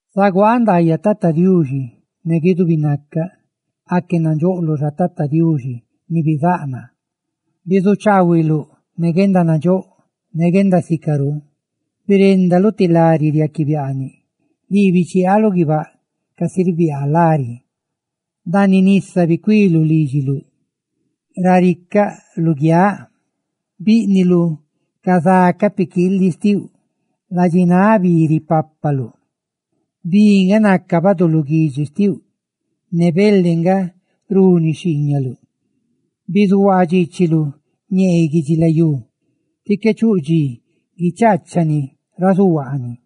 ¡Zaguaaꞌ ndaayaꞌ Tata Diuxi ne guidubi nacaꞌ! ¡Aque nandxoꞌloꞌ xa, Tata Diuxi ni bizáꞌ naa! Bizuchaahuiluꞌ ne guendanandxóꞌ ne guendasicarú; biréndaluꞌ ti lari riaꞌquiꞌ biaaniꞌ. ¡Lii bichiaaluꞌ guibáꞌ casi ribiaa lari! ¡Ndaaniꞌ nisa bicuiluꞌ lídxiluꞌ, raricaꞌ, luguiáꞌ! ¡Bíꞌniluꞌ ca za ca piquiiliꞌa xtiuꞌ; ladxináꞌ bi ripapaluꞌ! Bi nga naca baduluguidxi xtiuꞌ, ne xtuxhu bele nga runi xhiiñaluꞌ. Bizuhuaa dxiichiluꞌ ñee guidxilayú ti qué chuꞌ dxi guichaachani ra zuhuaani.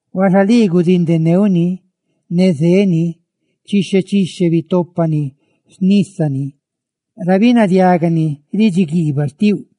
Huaxa lii gudindeneuꞌ ni, ne zeni; chixhe chixhe bitópani xnísani ra binadiagani ridxi guiibaꞌ xtiuꞌ.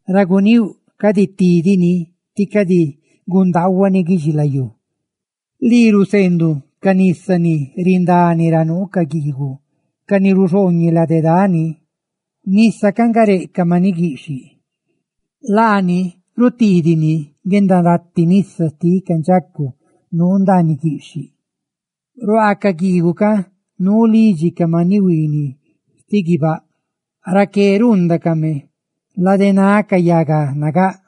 ra guníuꞌ cadi tídidini, tí cadi gundaahuani guidxilayú. Lii ruseenduꞌ ca nisa ni rindani ra nuu ca guiiguꞌ ca ni ruxhooñeꞌ lade dani. Nisa ca nga reꞌ ca maniꞌ guiꞌxhiꞌ; laani ritiidini guendarati nisa xtiꞌ ca ndxacu nuu ndaaniꞌ guiꞌxhiꞌ. Ruaa ca guiiguꞌ ca nuu lidxi ca maniꞌ huiiniꞌ xtiꞌ guibáꞌ; ¡raqué ruundacame, ladenáꞌ ca yaga nagáꞌ!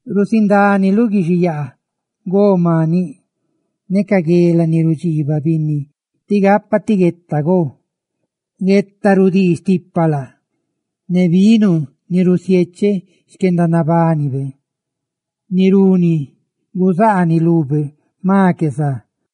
Rusindániluꞌ guixiyaa go maniꞌ, ne ca guela ni rudxiibaꞌ binni tí gapa ti gueta go, gueta rudii stipa laa, ne vino, ni rusiecheꞌ xquendanabanibe, ni runi guzaaniꞌ lube jma que za.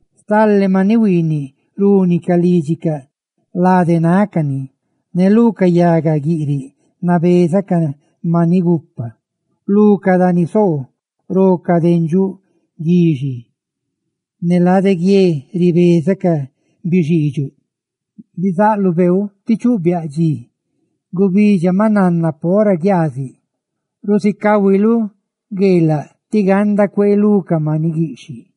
Stale maniꞌ huiiniꞌ rúnicaꞌ lídxicaꞌ lade nácani, ne lu ca yaga guiꞌriꞌ nabeza ca maniꞌ gupa. Lu ca dani nasoo ro ca dendxuꞌ guiꞌxhiꞌ, ne lade guie ribeza ca bixiidxuꞌ. Bizaꞌluꞌ beeu ti chuꞌ biaꞌ dxi; gubidxa maꞌ nanna pora guiaaziꞌ. Rusicahuiluꞌ gueelaꞌ, tí ganda cuee lú ca maniꞌ guiꞌxhiꞌ.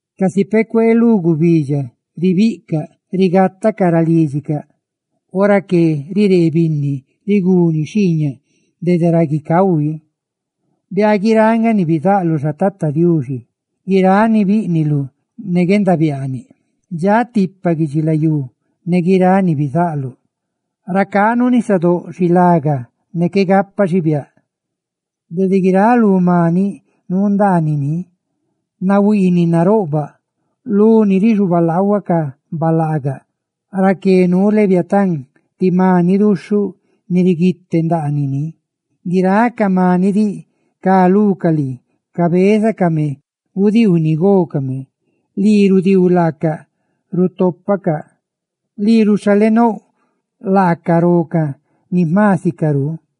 Casi peꞌ cuee lú gubidxa, ribiꞌcaꞌ rigatacaꞌ ra lídxicaꞌ. Ora que riree binni riguni xhiiñaꞌ dede ra guicahui. ¡Biaa guiráꞌ nga ni bizaꞌluꞌ xa, Tata Diuxi! Guiráꞌ ni biniꞌluꞌ ne guendabiaaniꞌ; ¡dxaꞌ tipa guidxilayú ne guiráꞌ ni bizaꞌluꞌ! Racá nuu nisadóꞌ, xilaga ne qué gapa xibiáꞌ, de guiráꞌ lú maniꞌ nuu ndaanini, nahuiiniꞌ, naroꞌbaꞌ; luni rixubalaahua ca balaagaꞌ, raqué nuu Leviatán, ti maniꞌ duxhuꞌni ni bizaꞌluꞌ quiteneni. Guiráꞌ ca maniꞌ diꞌ ca lucaꞌ lii cabézacame gudiiu ni gócame. Lii rudiiu, laaca rutopacaꞌ; lii ruxhalenouꞌ, laacaꞌ rocaꞌ ni jma sicarú;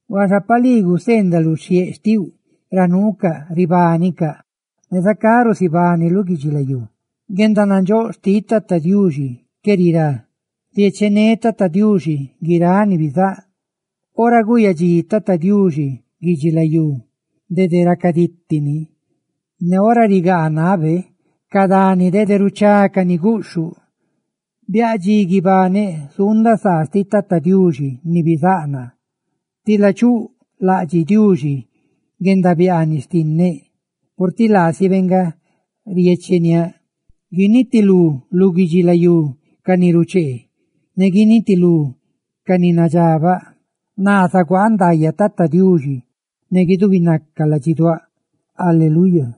Huaxa pa lii guseendaluꞌ xhieꞌdoꞌ xtiuꞌ ra nuucaꞌ, ribánicaꞌ, ne zacá rusibániluꞌ guidxilayú. ¡Guendanandxóꞌ xtiꞌ Tata Diuxi qué rirá! ¡Riechené Tata Diuxi guiráꞌ ni bizáꞌ! Ora guyadxí Tata Diuxi guidxilayú dede racaditi ni; ¡ne ora rigáꞌnabe ca dani dede ruchácani guꞌxhuꞌ! Biaꞌ dxi guibaneꞌ, zuundaꞌ saa xtiꞌ Tata Diuxi ni bizáꞌ naa. Tila chuꞌ laꞌdxiꞌ Diuxi guendabiaaniꞌ xtinneꞌ, purtiꞌ laasibe nga riecheniáꞌ. ¡Guinitilú lu guidxilayú ca ni ruchee! ¡Ne guinitilú ca ni nadxabaꞌ! ¡Naa zaguaaꞌ ndaayaꞌ Tata Diuxi ne guidubinaca ladxiduáꞌ! ¡Guisaca Diuxi!